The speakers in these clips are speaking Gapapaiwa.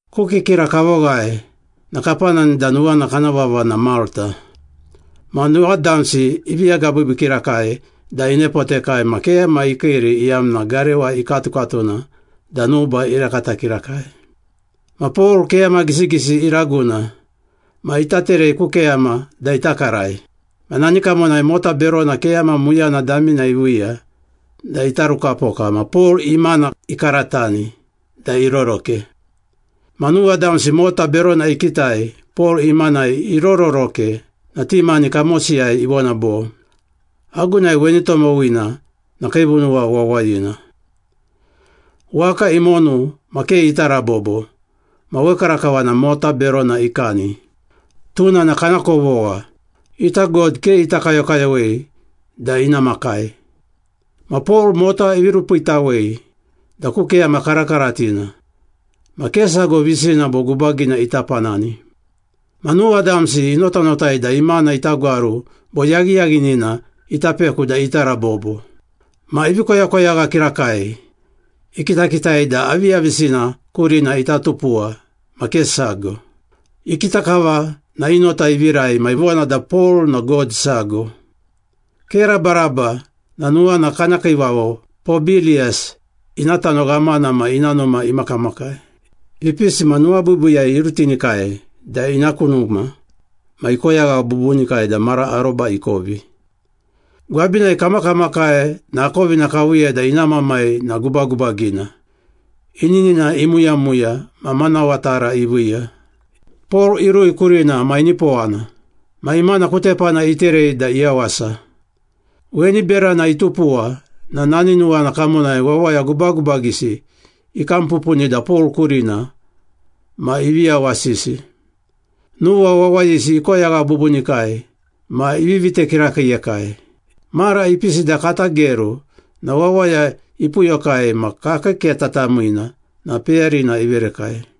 Ku kikira kavoghae na kapanani da nuwana kana vava na Malta. Ma nuwa damsi ivi agabiibii kirakai da inepotekai ma keyama ikiiri iyamna garewa ikatukatuna da nuba irakata kirakai. Ma Pol keyama gisigisi iraguna ma ita terei ku keyama da ita karai. Ma nani kamonai mota berona keyama muyana damina iviiya da itarukapoka ma Pol imana ikaratani da iroroke. Ma nuwa damsi mota berona ikitai Pol imanai irororoke na ti mani kamosiyai ivona bo, “Agunai weni tomowina na kiivunuwa wawayina. Waka imonu ma ke ita rabobo ma wekarakava na mota berona ikani. Tuna na kana kovogha. Ita god ke ita kayokayowei da ina makai.” Ma Pol mota ivi rupiitawei da ku keyama karakaratina, ma ke sago visina bo gubagina ita panani. Ma nuwa damsi inotanotai da imana ita gwaru bo yaghiyaghinina ita peku da ita rabobo. Ma ivi koyakoyagha kirakai, ikitakitai da aviyavisina kurina ita tupuwa ma ke sago. Ikita kava na i nota ivirai ma ivona da Pol na god sago. Ke rabaraba na nuwana kana kiivavo Pobiliyas ina tano ghamana ma ina numa imakamakai. Ipisi ma nuwabiibiiyai irutinikai da ina ku numa ma ikoyagha bubunikai da mara aroba ikovi. Gwabinai kamakamakai na akovina kaviiya da ina mamai na gubagubagina, ininina imuyamuya ma manawa tara iviiya. Pol irui kurina ma inipowana. Ma imana ku tepana iterei da iyawasa. Weni berana itupuwa na nani nuwana kamonai wawaya gubagubagisi ikam pupuni da Pol kurina ma ivi yawasisi. Nuwa wawayisi ikoyagha bubunikai ma ivi vite kirakiiyekai. Mara ipisi da kata geru na wawaya ipuyokai ma kakii keta tamiina na peyarina iverekai.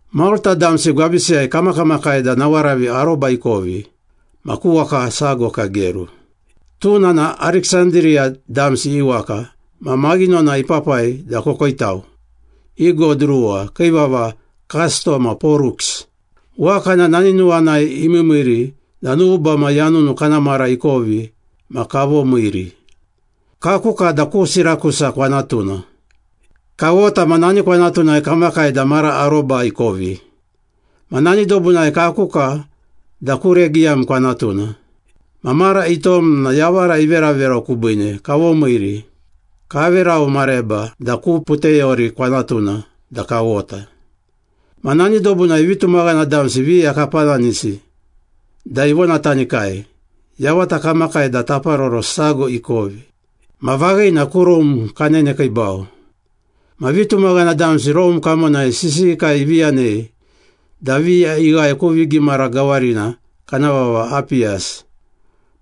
Malta damsi gwabisiyai kamakamakai da nawaravi aroba ikovi ma ku waka sago kageru. Tuna na Ariksandiriya damsi i waka ma maghinona ipapai da kokoitau, i god ruwa kii vava Kasto ma Poruks. Waka na nani nuwanai imiimiiri da nuba ma yanunu kana mara ikovi ma kavomiiri. Kakuka da ku Sirakusa kwanatuna. Kawota ma nani kwanatunai kamakai da mara aroba ikovi. Ma nani dobunai kakuka da ku Regiyam kwanatuna. Ma mara itom na yavara iveraverau kubiine kavomiiri, kaverau mareba da ku Puteyori kwanatuna da kawota. Ma nani dobunai vitumaghana damsi viya kapananisi da ivonatanikai, yavata kamakai da taparoro sago ikovi. Ma vaghina ku Rome kanenekiibau. Ma vitumaghana damsi Rome kamonai sisiyikai ivi yanei da viya ighae ku vigimara gawarina kana vava Apiyas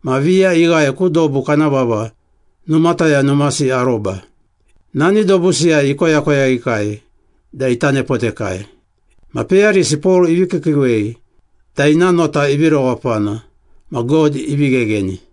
ma viya ighae ku dobu kana vava Numataya Numasi Aroba. Nani dobusiyai ikoyakoyaghikai da ita nepotekai. Ma peyarisi Pol ivi kiikiiwei da ina nota ivi rewapana ma God ivi ghegheni.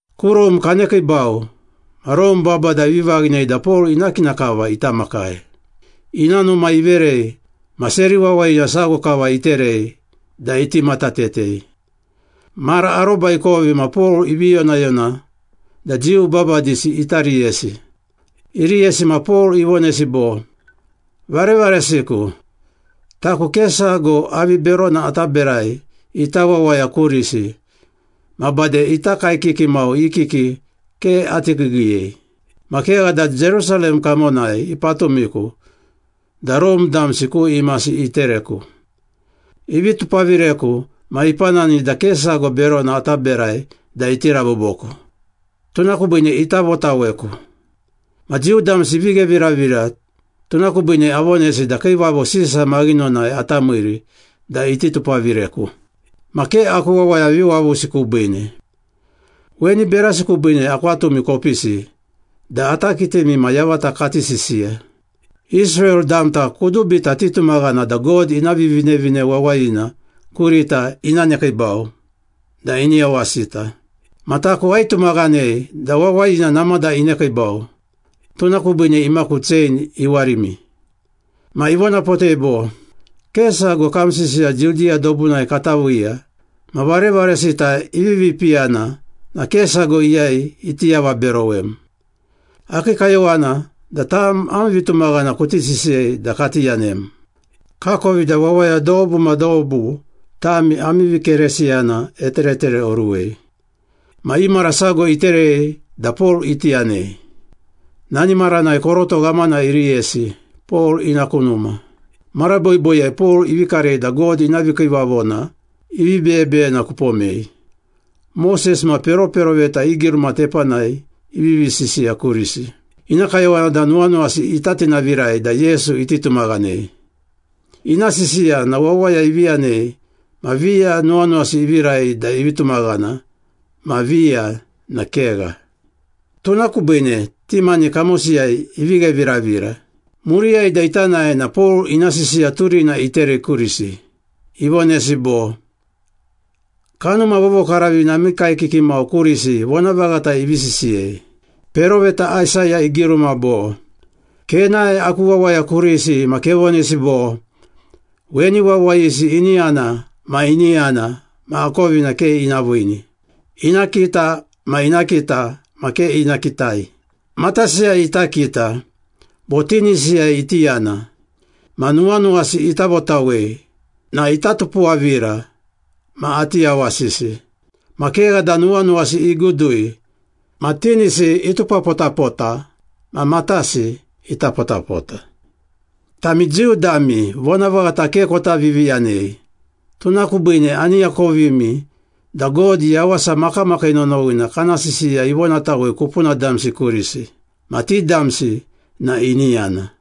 Ku Rome kanekiibau ma Rome babada ivi vaghinei da Pol ina kina kava ita makai. Ina numa iverei ma seri wawayina sago kava iterei da iti matatetei. Mara aroba ikovi ma Pol ivi yonayona da Jiu babadisi ita riyesi. Iriyesi ma Pol ivonesi bo, “Varevaresiku, taku ke sago avi berona ata berai ita wawaya kurisi ma bade ita kaekiki mau i kiki ke ati kiigiiyei. Ma kegha da, Jerusalem kamonai ipatumiku da Rome damsi ku imasi itereku. Ivi tupavireku ma ipanani da ke sago berona ata berai da iti raboboku, tuna kubiine ita votaweku. Ma Jiu damsi ivi gheviravira, tuna kubiine avonesi da Kiivavo Sisa maghinonai ata miiri da iti tupavireku. Ma ke aku wawaya viwavusi kubiine. Weni berasi kubiine akwatumi kopisi da ata kitimi ma yavata kati sisiya. Israel damta kudubita titumaghana da God ina Vivinevine Wawayina kurita ina nekiibau da ini yawasita. Ma taku aitumaghanei da wawayina namada inekiibau. Tuna kubiine imaku chein iwarimi.” Ma ivonapotei bo, “Ke sago kam sisiya Judiya dobunai kata viiya ma varevaresita ivivi piyana na ke sago iyai iti avaberowem. Akii kayowana da tam am vitumaghana kuti sisiyei da kati yanem. Kakovi da wawaya dobu ma dobu tami ami vikeresiyana eteretereoruwei.” Ma i mara sago iterei da Pol iti yanei. Nani maranai koroto ghamana iriyesi Pol ina ku numa. Mara boiboiyai Pol ivi karei da God ina vikiivavona ivi beyebeyena kupomei, Moses ma peroperoveta i giruma tepanai ivivi sisiya kurisi. Ina kayowana da nuwanuwasi ita tinavirai da Yesu iti tumaghanei. Ina sisiya na wawaya ivi yanei ma viya nuwanuwasi ivirai da ivi tumaghana ma viya na kegha. Tuna kubiine ti mani kamosiyai ivi gheviravira. Muriyai da ita nae na Pol ina sisiya turina iterei kurisi, ivonesi bo, “Kanuma Vovokaravina ami kaekiki mau kurisi vonavaghata ivi sisiyei. Peroveta Aisaya igiruma bo, ‘Kenae aku wawaya kurisi ma kevonesi bo, Weni wawayisi ini yana ma ini yana ma akovina ke ina viini. Ina kita ma ina kita ma ke ina kitai. Matasiyai ita kita, bo tinisiyai iti yana, ma nuwanuwasi ita votawei, na ita tupuwavira ma ati yawasisi. Ma kegha da nuwanuwasi igudui, ma tinisi itupapotapota, ma matasi itapotapota.’” “Tami Jiu dami vonavaghata ke kota viviyanei, tuna kubiine ani akovimi da God yawasa makamakii nonowina kana sisiya ivonatawei kupuna damsi kurisi. Ma ti damsi na ini yana.”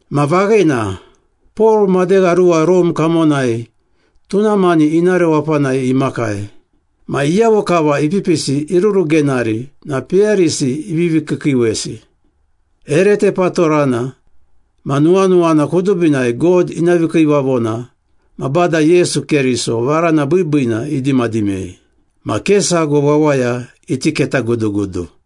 Ma vaghina, Pol madegha ruwa Rome kamonai tuna mani ina rewapanai imakai. Ma iyavo kava ipipisi irurugenari na peyarisi ivivi kiikiiwesi. Ere tepatorana ma nuwanuwana kudubinai God ina vikiivavona ma Bada Yesu Keriso varana biibiina idimadimei. Ma ke sago wawaya iti ketagudugudu.